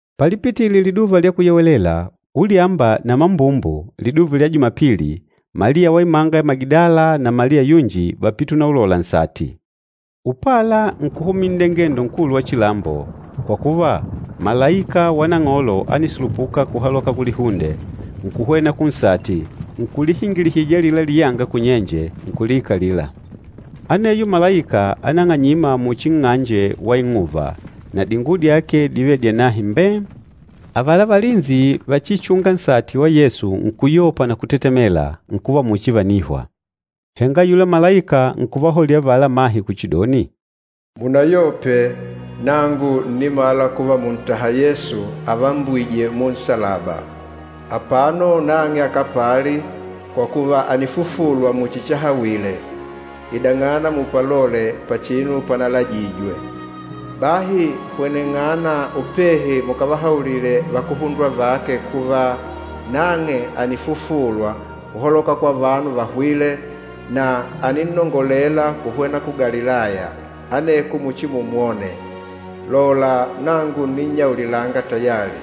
Palipitile Liduva lya Kuyewelela, ulyamba na mambumbu liduva lya Jumapili, Maliya wa imanga ya Magidala na Maliya yunji vápite unaulola nsati. Upala, nkuhumila nndengendo nkulu wa chilambo, kwa kuva malaika wa Nang'olo ánisulupuka kuhaloka kulihunde, nkuhwena kunsati, nkulihingilihija alila liyanga kunyenje, nkuliikalila. Aneyo malaika ánang'anyima muchi nng'anje wa ing'uva, na dinguwo dyake dívele dyanahe mbee! Avala valinsi vachichûnga nsati wa Yesu nkuyopa na kutetemela, nkuva muchi vànihwa. Henga ayula malaika nkuvahaulila avala amahe kuchidoni, “Munayope, nangu ǹnimala kuva mùntaha Yesu avambwîje munsalaba. Apano nang'e akapali, kwa kuva ànifufulwa muchi chahawile. Idananga mupalole pachinu panalajijwe. Bahi hweneng'ana upehi mukavahaulile vakuhundwa vake kuva, nang'e ànifufulwa uholoka kwa vanu vahwîle, na àninnongolela kuhwena ku Galilaya, aneko muchimumwone. Lola, nangu ǹninnyaulilanga tayali.”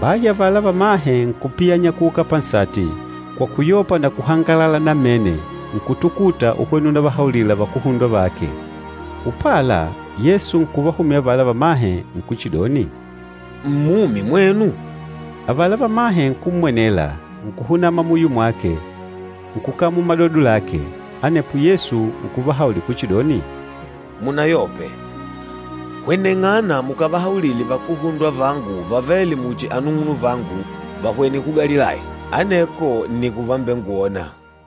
Bahi avala vamahe nkupiyanya kuuka pansati, kwa kuyopa na kuhangalala namene nkutukuta uhwena unavahaulila vakuhundwa vake. Upala, Yesu nkuvahumila avala vamahe, nkuchidoni, “Mmumi mwenu?” Avala vamahe nkummwenela, nkuhunama muyo mwake, nkukamula madodo lake. Anepo Yesu nkuvahaulila kuchidoni, “Munayope. Hweneng'ana mukavahaulile vakuhundwa vangu vavêle muchi anung'unuvangu vahwene ku Galilaya, aneko nni kuvambengwona.”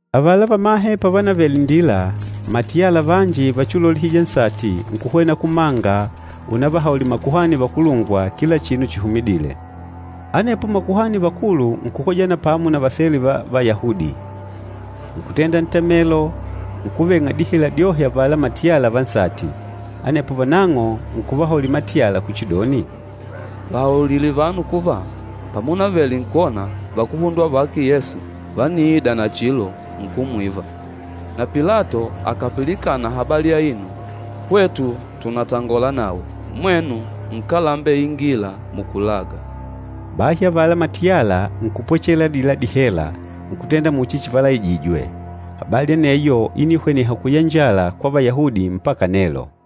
Avala vamahe pavanavele nndila, matiyala vanji vachiulolihija nsati nkuhwena kumanga unavahaulila makuhani vakulungwa kila chinu chihumidîle. Anepo makuhani vakulu nkukojana pamo na vasele va Vayahudi, nkutenda ntamelo, nkuveng'a dihela dyohe avala matiyala va nsati. Anepo vanang'o nkuvahaulila matiyala kuchidoni, “Vahaulile vanu kuva, pamunavele nkwona, vakuhundwa vake Yesu vániida nachilo, nkumwiva. Na Pilato akàpilikana habali aino, hwetu tunatangola nawe, mwenu nkalembeingila mukulaga.” Bahi avala matiyala nkupwechelela adila dihela nkutenda muchi chivalaijijwe. Habali aneyo ínihweneha kuyanjala kwa Vayahudi mpaka nelo.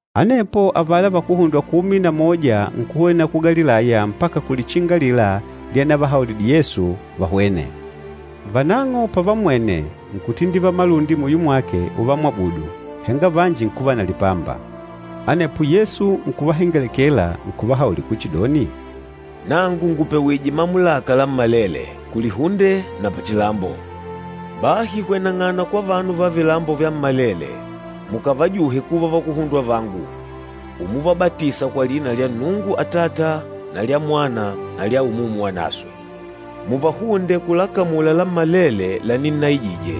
Anepo avala vakuhundwa kumi na moja nkuhwena ku Galilaya mpaka kulichinga alila lyanavahaulidile Yesu vahwene. Vanang'o pavammwene, nkutindivala malundi muyo mwake uvamwabudu, henga vanji nkuva na lipamba. Anepo Yesu nkuvahengelekela nkuvahaulila kuchidoni, “Nangu ngùpewije mamulaka lammalele, kulihunde na pachilambo. Bahi hweneng'ana kwa vanu va vilambo vyammalele mukavajuhe kuva vakuhundwa vangu, umuvabatisa kwa lina lya Nnungu Atata na lya Mwana na lya Umumu Wanaswe. Muvahunde kulakamula lammalele laninnaijije.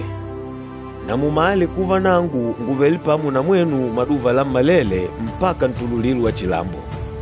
Na mumale kuva nangu ngùvele pamo na mwenu maduva lammalele mpaka ntululilo wa chilambo.”